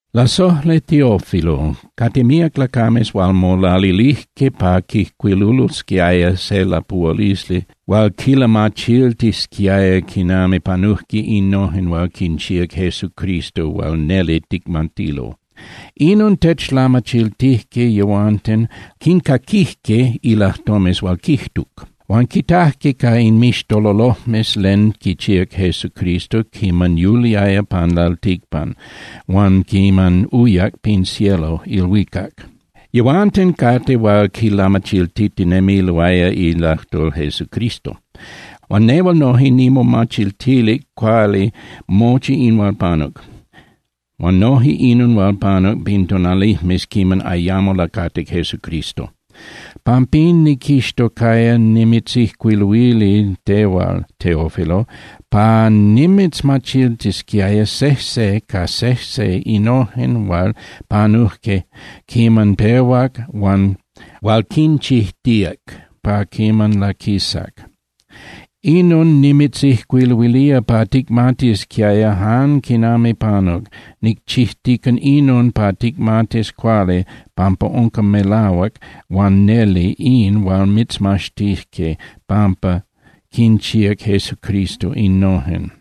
Lasojli Teófilo, cate míac lacames hual molalilijque pa quijcuilulosquiaya se lapuhualisli hual quilamachiltisquiaya quinami panujque innojen hual quinchíac Jesucristo hual neli ticmatilo. Inon techlamachiltijque yehuanten hual quincaquijque ilajtomes hual quijtuc. Huan quitajque ca inmixtololojmes len quichíac Jesucristo quiman yuliaya pan lalticpan huan quiman uyac pin cielo (ilhuicac). Yehuanten cate hual quilamachiltitinemiloaya ilajtol Jesucristo. Huan nehual noje nimomachiltilic cuali mochi in hual panuc, huan noje inon hual panuc pin tonalijmes quiman ayamo lacatic Jesucristo. Pampín niquixtocaya nimitzijcuiluili tehual, Teófilo, pa nimitzmachiltisquiaya sejse ca sejse innojen hual panujque quiman pehuac huan hual quinchijtíac pa quiman laquisac. Inon nimitzijcuiluilía pa ticmatisquiaya jan quinami panuc. Nicchijtica inon pa ticmatis cuali pampa unca melahuac huan neli in hual mitzmaxtijque pampa quinchíac Jesucristo innojen.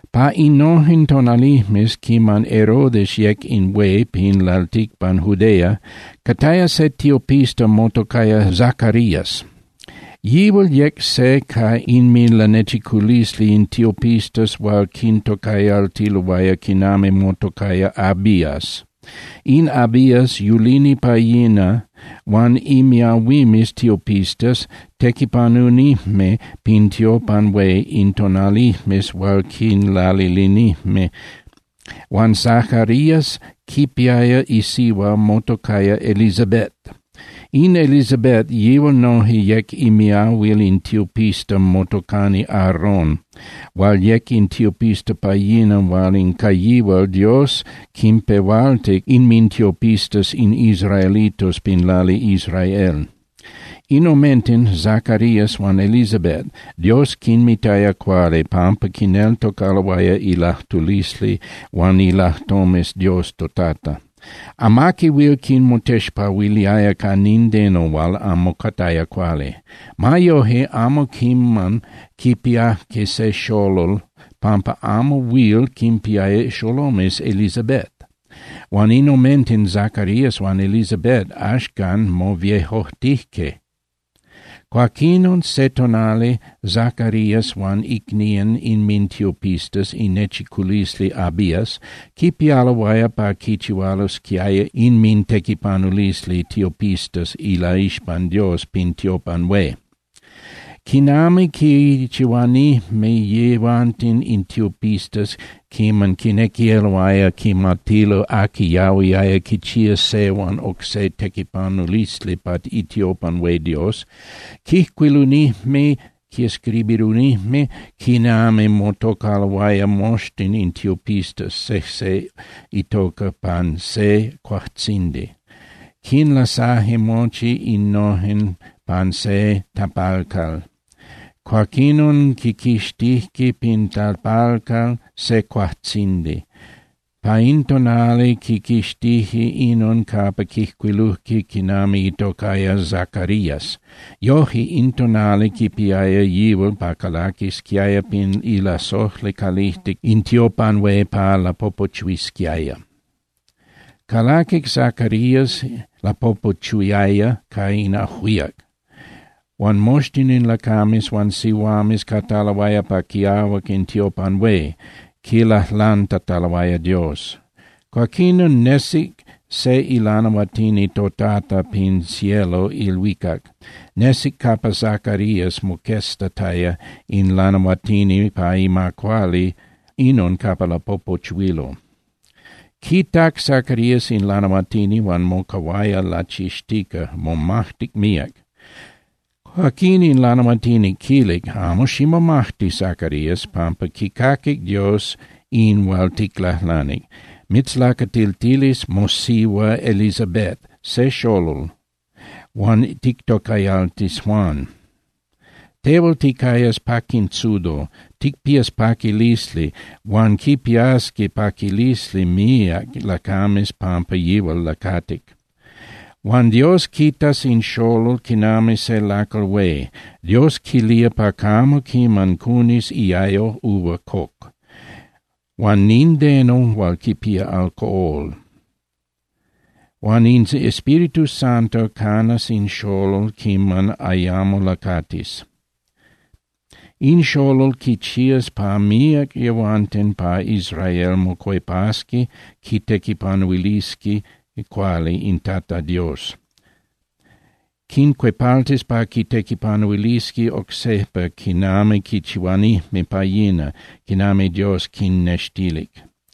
Pa innojen tonalijmes quiman Herodes yec in hué pin lalticpan Judea, cataya se tiopista motocaya Zacarías. Yihual yec se ca inminlanechiculisli in tiopistas hual quintocayaltiloaya quinami motocaya Abías. In Abías yulini pa yina huan imiahuimes tiopistas tequipanunijme pin tiopan hué in tonalijmes hual quinlalilinijme. Huan Zacarías quipiaya isihua motocaya Elisabet. In Elisabet, yihual noje yec imiahuil in tiopista motocani Aarón hual yec in tiopista pa yina hual ca yihual Dios quinpehualtic inmintiopistas in israelitos pin lali Israel. In omenten, Zacarías huan Elisabet, Dios quinmitaya cuali pampa quineltocaloaya ilajtulisli huan ilajtomes Dios toTata. Amaqui huil quinmotexpahuiliaya ca nindeno hual amo cataya cuali. Ma yoje, amo quiman quipiajque se xolol pampa amo huil quinpiaya xolomes Elisabet. Huan in omenten Zacarías huan Elisabet axcan moviejojtijque. Cuaquinon se tonali, Zacarías huan icnían inmintiopistas inechiculisli Abías quipialoaya pa quichihualosquiaya inmintequipanulisli tiopistas ilaixpan Dios pin tiopan hué. Quinami quichihuanijme yehuanten in tiopistas quiman quinequiloaya quimatilo aqui yahuiaya quichía se huan oc se tequipanulisli pa itiopan hué Dios, quijcuilunijme (quescribirunijme) quinami motocaloaya moxtin in tiopistas sejse itoca pan se cuajtzindi, quinlasaje mochi innojen pan se tapalcal. Cuaquinon quiquixtijque pin tapalcal se cuajtzindi. Pa in tonali, quiquixtije inon capa quijcuilujque quinami itocaya Zacarías. Yoje, in tonali quipiaya yihual pa calaquisquiaya pin ilasojli calijtic in tiopan hué pa lapopochuisquiaya. Calaquic Zacarías, lapopochuiaya ca in ajuíac, huan moxtin in lacames huan sihuames cataloaya pa quiahuac in tiopan hué, quilajlantataloaya Dios. Cuaquinon nesic se ilanahuatini toTata pin cielo (ilhuicac). Nesic capa Zacarías, moqueztataya in lanahuatini pa ima cuali inon capa lapopochuilo. Quitac Zacarías in lanahuatini huan mocahuaya lachixtica, momajtic míac. Cuaquín in lanahuatini quilic: —Amo ximomajti, Zacarías, pampa quicaquic Dios in hual ticlajlanic. Mitzlacatiltilis mosihua Elisabet se xolol, huan tictocayaltis Juan. Tehual ticayas paquintzudo, ticpías paquilisli, huan quipiasqui paquilisli míac lacames pampa yihual lacatic. ’Huan Dios quitas in xolol quinami se lacal hué. Dios quilía pa camo quiman cunis iayo uva coc, huan nindeno hual quipía alcohol. Huan in Espíritu Santo canas in xolol quiman ayamo lacatis. In xolol quichías pa míac yehuanten pa Israel mocuepasqui quitequipanuilisqui cuali in Tata Dios. Quincuepaltis pa quitequipanuilisqui oc sejpa quinami quichihuanijme pa yina, quinami Dios quinnextilic.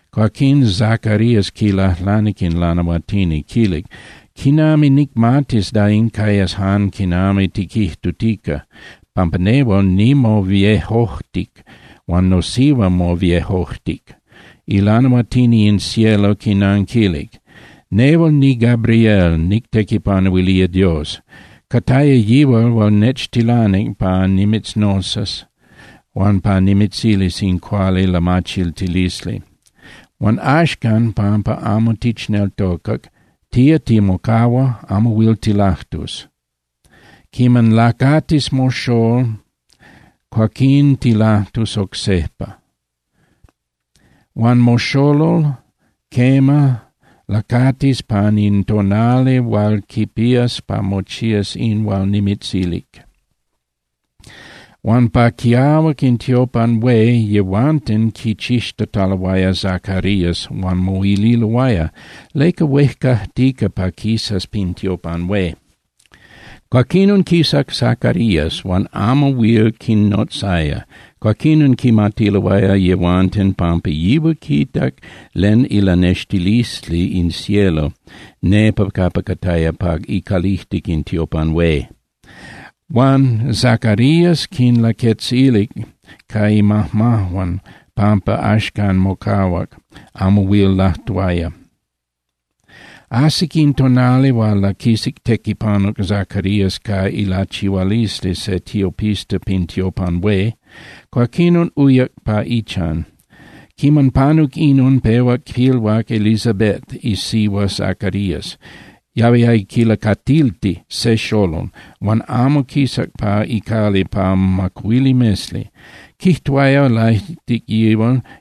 Cuaquín Zacarías quilajlanic in lanahuatini, quilic: —¿Quinami nicmatis da in cayas jan quinami tiquijtutica? Pampa nehual nimoviejojtic huan nosihua moviejojtic. Ilanahuatini in cielo quinanquilic: —Nehual niGabriel, nictequipanuilía Dios. Cataya yihual hual nechtilanic pa nimitznotzas huan pa nimitzilis in cuali lamachiltilisli. Huan axcan, pampa amo tichneltocac, tía timocahua, amo huil tilajtus. Quiman lacatis moxolol, cuaquín tilajtus oc sejpa. Huan moxolol, quema, lacatis pan in tonali hual quipías pa mochías in hual nimitzilic. Huan pa quiahuac in tiopan hué yehuanten quichixtataloaya Zacarías huan moililoaya: —¿Leca huejcajtica pa quisas pin tiopan hué? Cuaquinon quisac Zacarías, huan amo huil quinnotzaya. Cuaquinon quimatiloaya yehuanten pampa yihual quitac len ilanextilisli in cielo nepa capa cataya pa icalijtic in tiopan hué. Huan Zacarías quinlaquetzilic ca imajmajuan pampa axcan mocahuac, amo huil lajtuaya. Ajsic in tonali hual laquisac tequipanuc Zacarías ca ilachihualisli se tiopista pin tiopan hué, cuaquinon uyac pa ichan. Quiman panuc inon, pehuac pilhuac Elisabet isihua Zacarías, yahuiaya quilacatilti se xolol, huan amo quisac pa icali pa macuili mesli. Quijtuaya laijtic yihual: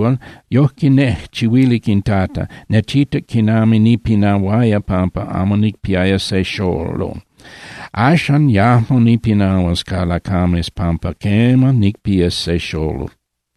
“Yojque nejchihuilic in Tata, nechitac quinami nipinahuaya pampa amo nicpiaya se xolol. Axcan yajmo nipinahuas ca lacames pampa quema, nicpías se xolol.”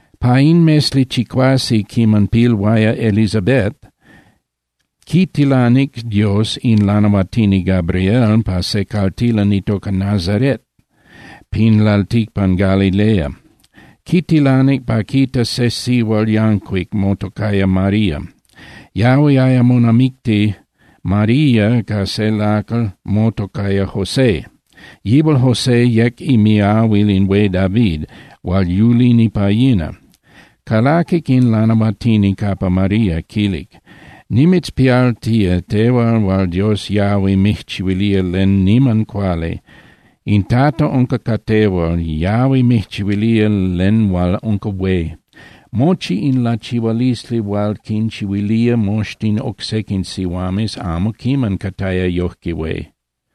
Pa in mesli chicuase quiman pilhuaya Elisabet, quitilanic Dios in lanahuatini Gabriel pa se caltilan itoca Nazaret pin lalticpan Galilea. Quitilanic pa quitas se sihual yancuic motocaya María. Yahuiaya monamicti María ca se lacal motocaya José. Yihual José yec imiahuil in hué David hual yulini pa yina. Calaquic in lanahuatini capa María, quilic: —Nimitzpialtía, tehual hual Dios yahui mijchihuilía len niman cuali. In Tata unca ca tehual, yahui mijchihuilía len hual unca hué. Mochi in lachihualisli hual quinchihuilía moxtin oc sequin sihuames amo quiman cataya yojque hué.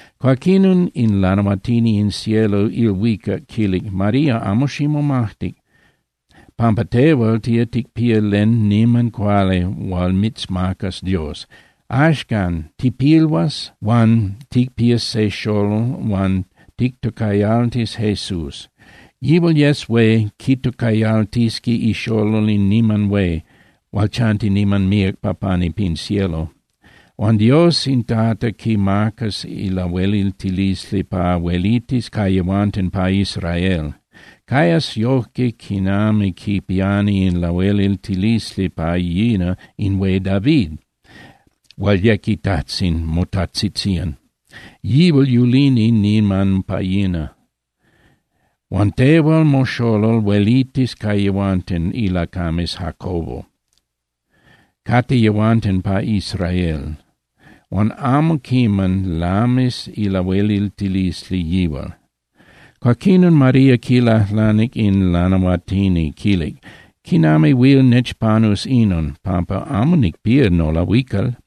Cuaquinon in ilanahuatini in cielo (ilhuicac) quilic: —María, amo ximomajti, pampa tehual tía ticpía len niman cuali hual mitzmacas Dios. Axcan, tipilhuas huan ticpías se xolol huan tictocayaltis Jesús. Yihual yes hué, quitocayaltisqui ixolol in niman hué hual chanti niman míac pa pani pin cielo. Huan Dios in Tata quimacas ilahueliltilisli pa huelitis ca yehuanten pa Israel. Cayas yojque quinami quipiani in lahueliltilisli pa yina in hué David hual yec itajtzin motajtzitzían, yihual yulini niman pa yina. Huan tehual moxolol huelitis ca yehuanten ilacames Jacobo, cate yehuanten pa Israel, huan amo quiman lamis ilahueliltilisli yihual. Cuaquinon María quilajlanic in lanahuatini, quilic: —¿Quinami huil nechpanus inon? Pampa amo nicpía nolahuical.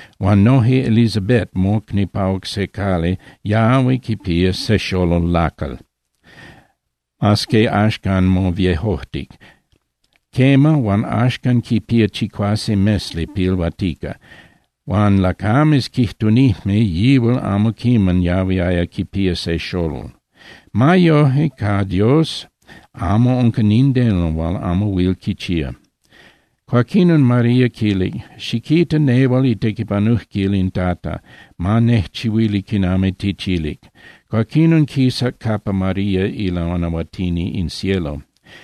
Huan noje Elisabet mocni pa oc se cali yahui quipía se xolol lacal, mas que axcan moviejojtic. Quema, huan axcan quipía chicuase mesli pilhuatica. Huan lacames quijtunijme yihual amo quiman yahuiaya quipía se xolol. Ma yoje, ca Dios amo unca nindeno hual amo huil quichía. Cuaquinon María quilic: —Xiquita, nehual itequipanujquil in Tata. Ma nejchihuili quinami tichilic. Cuaquinon quisac capa María ilanahuatini in cielo.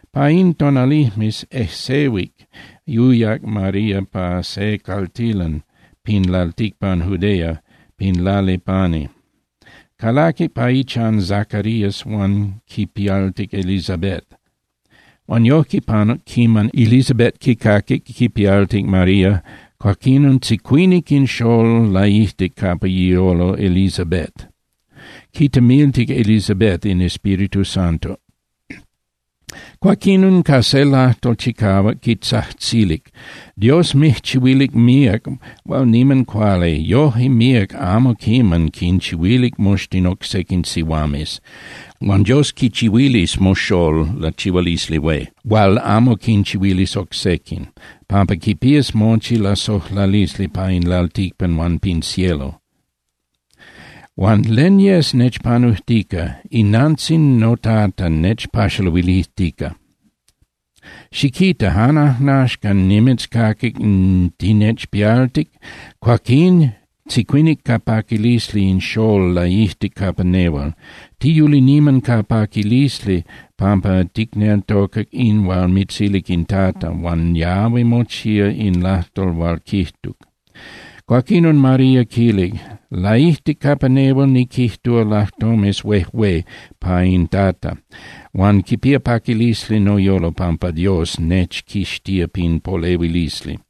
Pa in tonalijmes ejsehuic uyac María pa se caltilan pin lalticpan Judea, pin lali pani. Calaquic pa ichan Zacarías huan quipialtic Elisabet. Huan yojque panuc quiman Elisabet quicaquic quipialtic María, cuaquín tzicuinic in xolol laijtic capa iyolo Elisabet, quitemiltic Elisabet in Espíritu Santo. Cuaquinon ca se lajtol chicahuac, quitzajtzilic: —Dios mijchihuilic míac hual niman cuali. Yoje míac amo quiman quinchihuilic moxtin oc sequin sihuames. Huan Dios quichihuilis moxolol lachihualisli hué, hual amo quinchihuilis oc sequin, pampa quipías mochi lasojlalisli pa in lalticpan huan pin cielo. Huan ¿len yes nechpanujtica? ¡Inantzin noTata nechpaxaluilijtica! Xiquita, jan ajnaxcan nimitzcaquic tinechpialtic, cuaquín tzicuinic ca paquilisli in xolol laijtic capa nehual. Tiyuli niman ca paquilisli pampa ticneltocac in hual mitzilic in Tata, huan yahui mochía in lajtol hual quijtuc. Cuaquinon María quilic: Laijtic capa nehual niquijtúa lajtomes huejué pa in Tata, huan quipía paquilisli noyolo pampa Dios nechquixtía pin polehuilisli.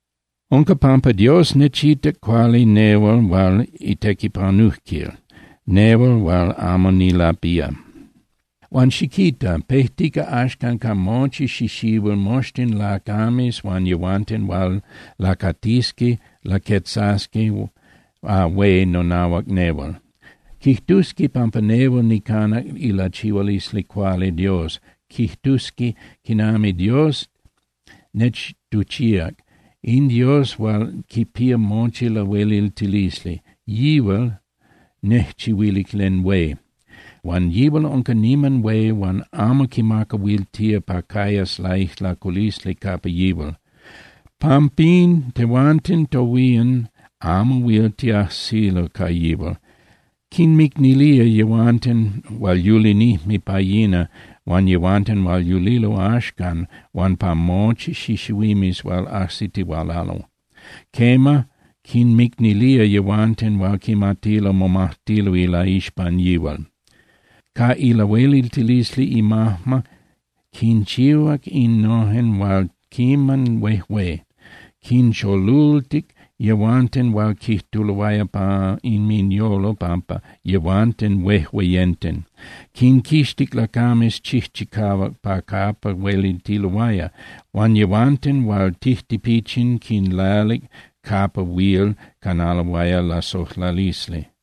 Unca pampa Dios nechitac cuali nehual hual itequipanujquil, nehual hual amo nilapía. Huan xiquita, pejtica axcan pa mochi xixihuil, moxtin lacames huan yehuanten hual lacatisqui laquetzasqui hué nonahuac nehual. Quijtusqui pampa nehual nicanac ilachihualisli cuali Dios, quijtusqui quinami Dios nechtuchíac. In Dios hual quipía mochi lahueliltilisli, yihual nejchihuilic len hué. Huan yihual unca niman hué huan amo quimacahuiltía pa cayas laijlaculisli capa yihual. Pampín tehuanten tohuían amo huil tiajsilo ca yihual. Quinmicnilía yehuanten hual yulinijme pa yina huan yehuanten hual yulilo axcan huan pa mochi xixihuimes hual ajsitihualalo. Quema, quinmicnilía yehuanten hual quimatilo momajtilo ilaixpan yihual. Ca ilahueliltilisli imajma quinchihuac innojen hual niman huejué: quincholultic yehuanten hual quijtuloaya pa inminyolo pampa yehuanten huejueyenten. Quinquixtic lacames chijchicahuac pa capa huelitiloaya, huan yehuanten hual tijtipichin quinlalic capa huil canaloaya lasojlalisli.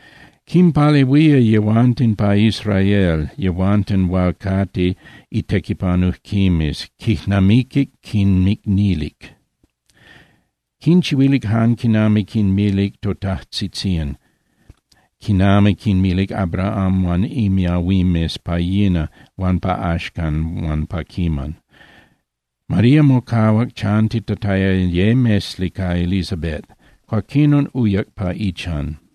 Quinpalehuía yehuanten pa Israel, yehuanten hual cate itequipanujquimes, quijnamiquic quinmicnilic. Quinchihuilic jan quinami quinmilic totajtzitzían, quinami quinmilic Abraham huan imiahuimes pa yina huan pa axcan huan pa quiman. María mocahuac chantitataya ye mesli ca Elisabet, cuaquinon uyac pa ichan.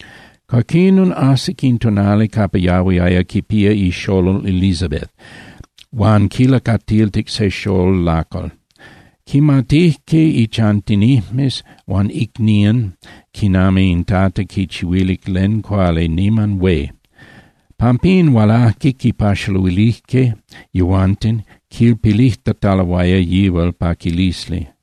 Cuaquinon, ajsic in tonali capa yahuiaya quipía ixolol Elisabet huan quilacatiltic se xolol lacal. Quimatijque ichantinijmes huan icnían quinami in Tata quichihuilic len cuali niman hué. Pampín hualajque quipaxaluilijque yehuanten, quipilijtataloaya yihual paquilisli.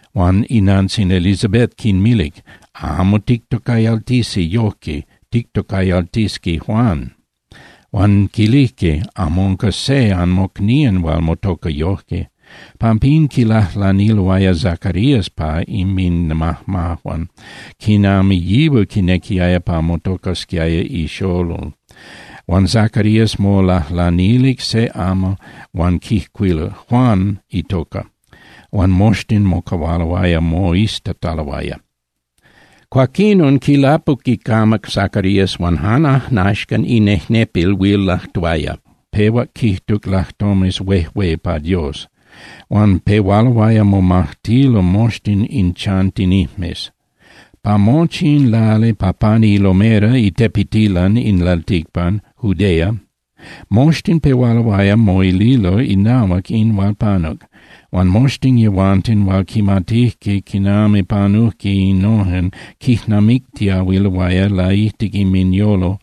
Huan inantzin Elisabet quinmilic: —Amo tictocayaltisqui yoje, tictocayaltisqui Juan. Huan quilijque: —Amo unca se anmocnían hual motoca yoje. Pampín quilajlaniloaya Zacarías ca inminmajmajuan quinami yihual quinequiaya pa motocasquiaya ixolol. Huan Zacarías molajlanilic se amal huan quijcuiluc: “Juan itoca.” Huan moxtin mocahualoaya moiztataloaya. Cuaquinon quilapuc icamac Zacarías huan jan ajnaxcan inejnepil huil lajtuaya, pehuac quijtuc lajtomes huejué pa Dios. Huan pehualoaya momajtilo moxtin in chantinijmes. Pa mochi in lali pa pani ilomera (itepetilan) in lalticpan Judea, moxtin pehualoaya moililo inahuac in hual panuc. Huan moxtin yehuanten hual quimatijque quinami panujque innojen quijnamictiahuiloaya laijtic inminyolo,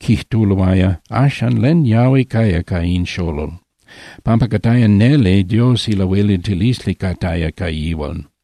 quijtuloaya: —Axan, ¿len yahui caya ca in xolol? Pampa cataya neli Dios ilahueliltilisli cataya ca yihual.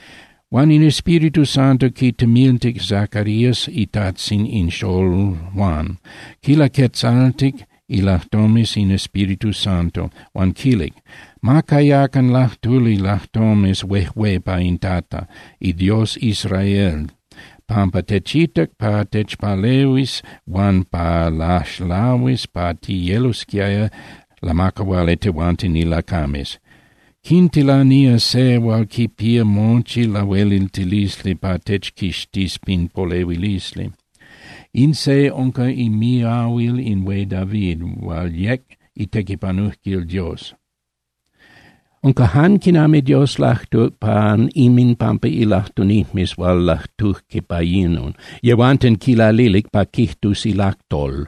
Huan in Espíritu Santo quitemiltic Zacarías itajtzin in xolol Juan, quilaquetzaltic ilajtomes in Espíritu Santo, huan quilic: Ma cayacan lajtuli lajtomes huejué pa in Tata, iDios Israel, pampa techitac pa techpalehuis huan pa laxlahuis pa tiyelosquiaya lamacahuali tehuanten ilacames. Quitilanía se hual quipía mochi lahueliltilisli pa techquixtis pin polehuilisli. In se unca imiahuil in hué David hual yec itequipanujquil Dios. Unca jan quinami Dios lajtuc pan inminpampa ilajtunijmes hual lajtujque pa yina, yehuanten quinlalilic pa quijtus ilajtol.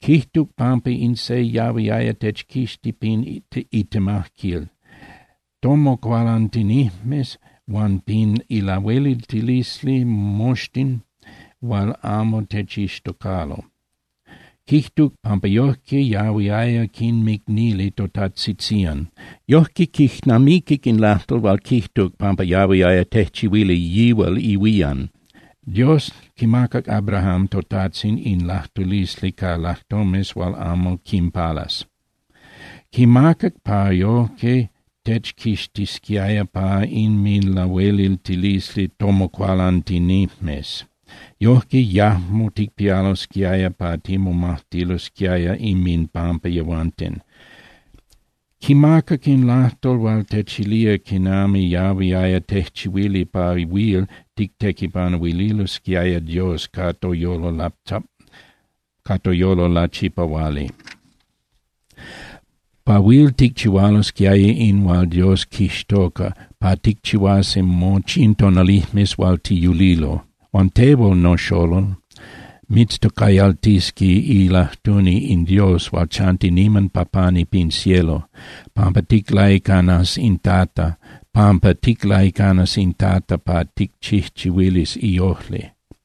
Quijtuc pampa in se yahuiaya techquixti pin itemajquil tomocualantinijmes huan pin ilahueliltilisli moxtin hual amo techixtocalo. Quijtuc pampa yojque yahuiaya quinmicnili totajtzitzían. Yoje quijnamiquic in lajtol hual quijtuc pampa yahuiaya tejchihuili yihual ihuían. Dios quimacac Abraham totajtzin in lajtulisli ca lajtomes hual amo quinpalas. Quimacac pa yoje techquixtisquiaya pa inminlahueliltilisli tomocualantinijmes. Yojque yajmo ticpialosquiaya pa timomajtilosquiaya inminpampa yehuanten. Quimacac in lajtol hual techilía quinami yahuiaya tejchihuili pa huil tictequipanuililosquiaya Dios ca toyolo lachipahuali, pa huil ticchihualosquiaya in hual Dios quixtoca pa ticchihuasi mochi in tonalijmes hual tiyulilo. Huan tehual, noxolol, mitztocayaltisqui ilajtuni in Dios hual chanti niman pa pani pin cielo, pampa ticlaicanas in Tata pa ticchijchihuilis iojli.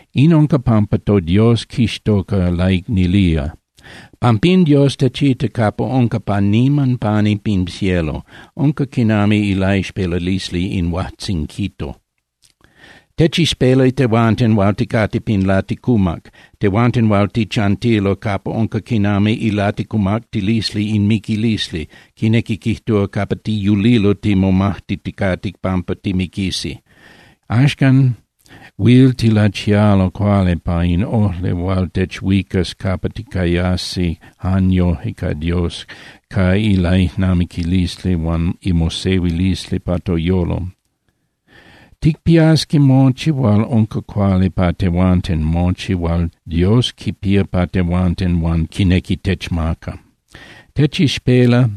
In unca pampa toDios quixtoca laicnilía. Pampín Dios techita capa unca pa niman pani pin cielo, unca quinami ilaixpelalisli in huajtzinquito. Techixpela tehuanten hual ticate pin laticumac, tehuanten hual tichantilo capa unca quinami ilaticumactilisli in miquilisli, quinequi quijtúa, capa tiyulilo timomajtiticate pampa timiquisi. Axcan huil tilachialo cuali pa in ojli hual techhuicas capa ticayasi jan yoje ca Dios ca ilaijnamiquilisli huan imosehuilisli pa toyolo. Ticpiasqui mochi hual unca cuali pa tehuanten, mochi hual Dios quipía pa tehuanten huan quinequi techmaca. Techixpela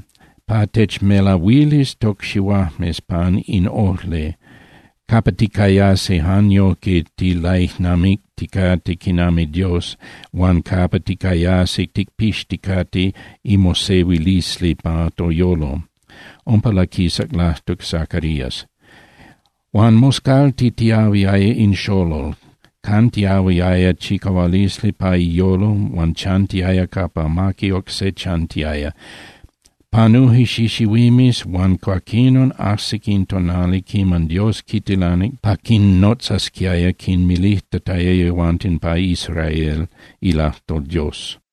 pa techmelahuilis tocxihuajmes pan in ojli capa ticayasi jan yojque tilaijnamicticate quinami Dios huan capa ticayasi ticpixticate imosehuilisli pa toyolo. Umpa laquisac lajtuc Zacarías. Huan moscaltitiyahuiaya in xolol, cantiyahuiaya chicahualisli pa iyolo huan chantiaya capa amaqui oc se chantiaya. Panuje xixihuimes huan cuaquinon ajsic in tonali quiman Dios quitilanic pa quinnotzasquiaya quinmilijtataya yehuanten pa Israel ilajtol Dios.